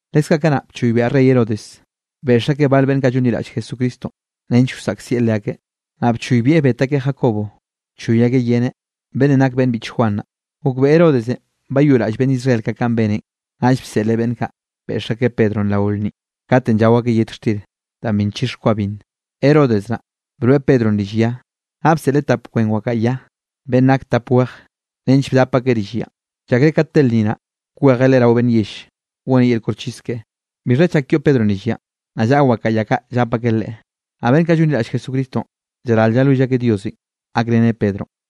Leskaꞌ kanaꞌ bchoybiaꞌ rey Herodes, beꞌx akeꞌ bal beꞌnn kaꞌ llonliraꞌll Jesucristonꞌ, nench wsaꞌkzieꞌ leakeꞌ. Naꞌ bchoybieꞌ bet akeꞌ Jacobo, bchoy akeꞌ yeneꞌ, beꞌnnenꞌ nak beꞌnn biꞌch Juan naꞌ. Gokbeꞌe Herodesenꞌ bayoꞌraꞌll beꞌnn Israel kaꞌ kanꞌ beneꞌn, naꞌll bseꞌleꞌ beꞌnn kaꞌ, beꞌx akeꞌ Pedronꞌ rao lnninꞌ, katenꞌ llao akeꞌ yet xtir danꞌ bi nchix kwa binn. Herodes naꞌ, broeꞌ Pedronꞌ rill ya, naꞌ bseꞌleꞌ tap kwen wakaꞌa ya, beꞌnn nak tap wej, nench bdap akeꞌ rill yanꞌ. Llakreꞌ ka te lnni naꞌ, kwejeꞌ leꞌe rao beꞌnn yell, goneꞌ yel koxchis keꞌe. Bixha chak yoꞌ Pedronꞌ rill yanꞌ, naꞌ llaꞌa wakaꞌa ya kaꞌ llap akeꞌ leꞌe, naꞌ beꞌnn kaꞌ llonliraꞌll Jesucristonꞌ, llaral llalwill akeꞌ Diosenꞌ gakreneꞌ Pedronꞌ.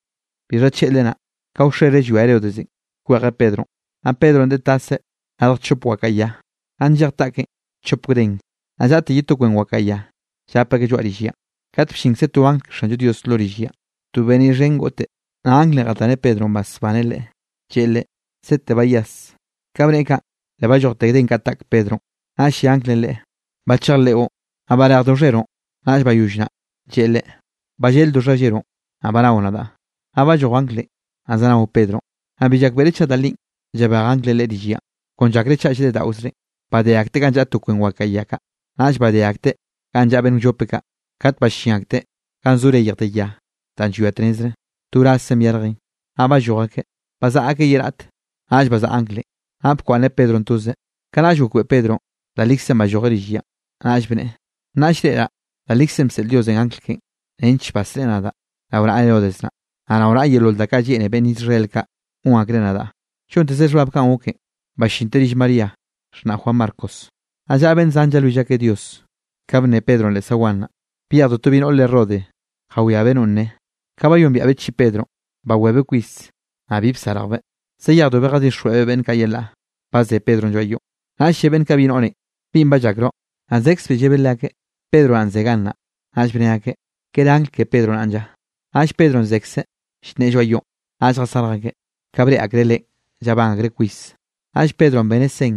Bixha tlleꞌle naꞌ, ka wxere llwia Herodesenꞌ kwejeꞌ Pedronꞌ. Naꞌ Pedronꞌ deꞌe taseꞌ radj chop wakaꞌa ya, naꞌ nllej taꞌkeꞌn chop gden, naꞌ llaꞌte ye to kwen wakaꞌa ya, llap akeꞌ lloaꞌ rill yanꞌ. Kat bllinkze to angl ke Xanllo Dios lo rill yanꞌ, to beniꞌ xhen goꞌte, naꞌ anglenꞌ jataneꞌ Pedronꞌ basbaneꞌ leꞌe, lleꞌe leꞌe: —¡Sete byase! Ka bneꞌe kaꞌn, le ballojte gden kaꞌ taꞌk Pedronꞌ. Naꞌll lle anglenꞌ leꞌe: —Bachej leꞌon, naꞌ barejdo xheroꞌn. Naꞌll bayoll naꞌ, lleꞌe leꞌe: —Balleldo xhalleroꞌn, naꞌ banao nadaꞌ. Naꞌ balloj anglenꞌ, naꞌ zanao Pedronꞌ, naꞌ bi llakbeꞌreꞌ chaꞌ da linꞌ llabej anglenꞌ leꞌe rill yanꞌ, kon llakreꞌ chaꞌ llreꞌdaꞌozreꞌn. Badé akteꞌ ganꞌ llaꞌa to kwen wakaꞌa ya kaꞌ, naꞌll badé akeꞌ ga llaꞌa beꞌnn wllope kaꞌ. Kat ballín akteꞌ ga zo reyj de ya danꞌ llwia tnezre, to wrazzen byarjen, naꞌ balloj akeꞌ. Bzaꞌa akeꞌ ye raꞌt, naꞌll bazaꞌa anglenꞌ, naꞌ bakwaꞌnneꞌ Pedronꞌ toze. Kanaꞌll gokbeꞌe Pedronꞌ da likzenꞌ ballojeꞌ rill yanꞌ, naꞌll bneꞌe: —Nnaꞌll llreꞌraꞌ da likzenꞌ bseꞌl Diosenꞌ angl keꞌen, nench basreꞌe nadaꞌ rao naꞌa Herodes naꞌ, naꞌ rao yeolol da kaꞌ lleꞌne beꞌnn Israel kaꞌ gon akreꞌ nadaꞌ. Llontezeꞌ xhbab kanꞌ goken, ballinteꞌ rill María xhnaꞌ Juan Marcos, naꞌ llaꞌa beꞌnn zan llalwill akeꞌ Dios. Ka bnne Pedronꞌ leꞌ zaguan naꞌ, byejdo to bi noꞌr re Rode jawiabeꞌ nonꞌ nne. Ka bayombiaꞌbeꞌ chiꞌi Pedronꞌ, bawebeꞌ kwis, naꞌ bi bsarjbeꞌ, zayejdobeꞌ jatixjweꞌbeꞌ beꞌnn kaꞌ yelaꞌ, ba ze Pedronꞌ lloaꞌ yoꞌn. Naꞌll lle beꞌnn kaꞌ bi noꞌrenꞌ: —¿Binꞌ ba llakroꞌ? Naꞌ zekzbeꞌ llebeꞌ leakeꞌ, Pedro naꞌn ze gannaꞌ. Naꞌll bne akeꞌ: —¿Kere angl ke Pedro naꞌn lla? Naꞌll Pedronꞌ zekzeꞌ llnneꞌe lloaꞌ yoꞌn, naꞌll jasarj akeꞌ. Ka breꞌe akreꞌ leꞌen, llabán akreꞌ kwis. Naꞌll Pedronꞌ beneꞌ sen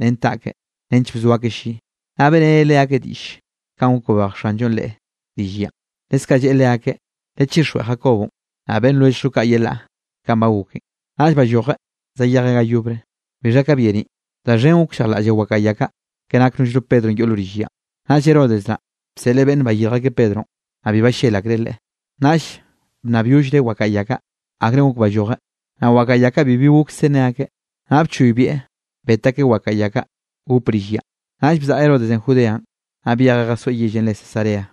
ren taꞌkeꞌ nench bzo akeꞌ lli, naꞌ beꞌreneꞌ leakeꞌ diꞌll kanꞌ gok babej Xanllonꞌ leꞌe rill yanꞌ, leskaꞌ lleꞌe leakeꞌ: —Lechixjweꞌ Jacobonꞌ, naꞌ beꞌnn lwelljllo kaꞌ yelaꞌ kanꞌ ba goken. Naꞌll ballojeꞌ zayejeꞌ ga yobre. Bixha ka byeniꞌ, da xhen gokllejlaꞌll wakaꞌa ya kaꞌ, ke nak nollno Pedronꞌ yoꞌ lo rill yanꞌ. Naꞌll Herodes naꞌ, bseꞌleꞌ beꞌnne bayirj akeꞌ Pedronꞌ, naꞌ bi ballel akreꞌ leꞌe, naꞌll bnnabyollreꞌ wakaꞌa ya kaꞌ, akre gok ballojeꞌ, naꞌ wakaꞌa ya kaꞌ bibi gokse nne akeꞌ. Naꞌ bchoybieꞌ bet akeꞌ wakaꞌa ya kaꞌ gop rill yanꞌ. Naꞌll bzaꞌa Herodesenꞌ Judeanꞌ, naꞌ byejeꞌ jasoeꞌ yellenꞌ re Cesarea.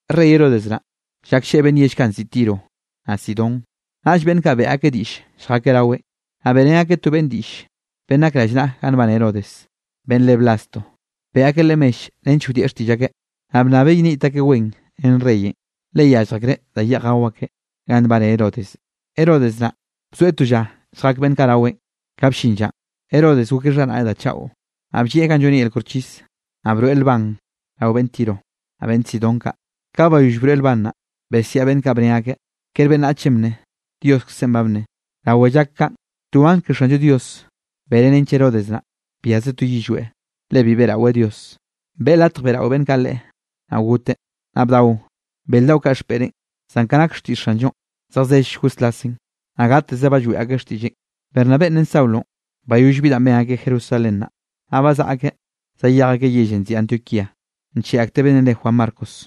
Rey Herodes naꞌ, llaklleꞌe beꞌnn yell kaꞌ nziꞌi Tiro, naꞌ Sidón. Naꞌll beꞌnn kaꞌ beꞌe akeꞌ diꞌll lljakeꞌ raweꞌn, naꞌ beꞌrén akeꞌ to beꞌnne diꞌll, beꞌnn nak rallnaꞌa ganꞌ nbane Herodes, beꞌnn re Blasto. Beꞌe akeꞌ leꞌe mell nench wdieꞌ xtiꞌll akeꞌ, naꞌ bnnabeꞌ yeniꞌt akeꞌ wen ren reyenꞌ, le yallj akreꞌ da yeꞌj gao akeꞌ ganꞌ nbane Herodes. Herodes naꞌ bzoeꞌ to lla lljak beꞌnn kaꞌ raweꞌn. Ka bllin llanꞌ, Herodes gokeꞌ xharaꞌneꞌ da chaꞌo, naꞌ bllieꞌ ganꞌ lloneꞌ yel koxchis, naꞌ broeꞌ lban rao beꞌnn Tiro, naꞌ beꞌnn Sidón kaꞌ. Ka bayoll broeꞌ lban naꞌ, besiaꞌ beꞌnn kaꞌ bne akeꞌ: —¡Kere beꞌnnachenꞌ bnne, Dioskzenꞌ ba bnne! Rawe llak kaꞌn, to angl ke Xanllo Dios beneꞌ nench Herodes naꞌ, biaꞌzeꞌ to yillweꞌ, le bi beꞌraweꞌ Dios, beꞌe latj beꞌrao beꞌnn kaꞌ leꞌe. Naꞌ goteꞌ, naꞌ bdao bel daꞌo kaꞌ xpeꞌreꞌn. Zan ka nak xtiꞌll Xanllonꞌ, zejzell goslasen, naꞌ gateze ba lloeꞌ akeꞌ xtiꞌlleꞌn. Bernabé ren Saulonꞌ, bayoll bi danꞌ ben akeꞌ Jerusalén naꞌ, naꞌ bazaꞌa akeꞌ zayej akeꞌ yellenꞌ nziꞌi Antioquíanꞌ, ncheꞌe akteꞌ beꞌnnenꞌ re Juan Marcos.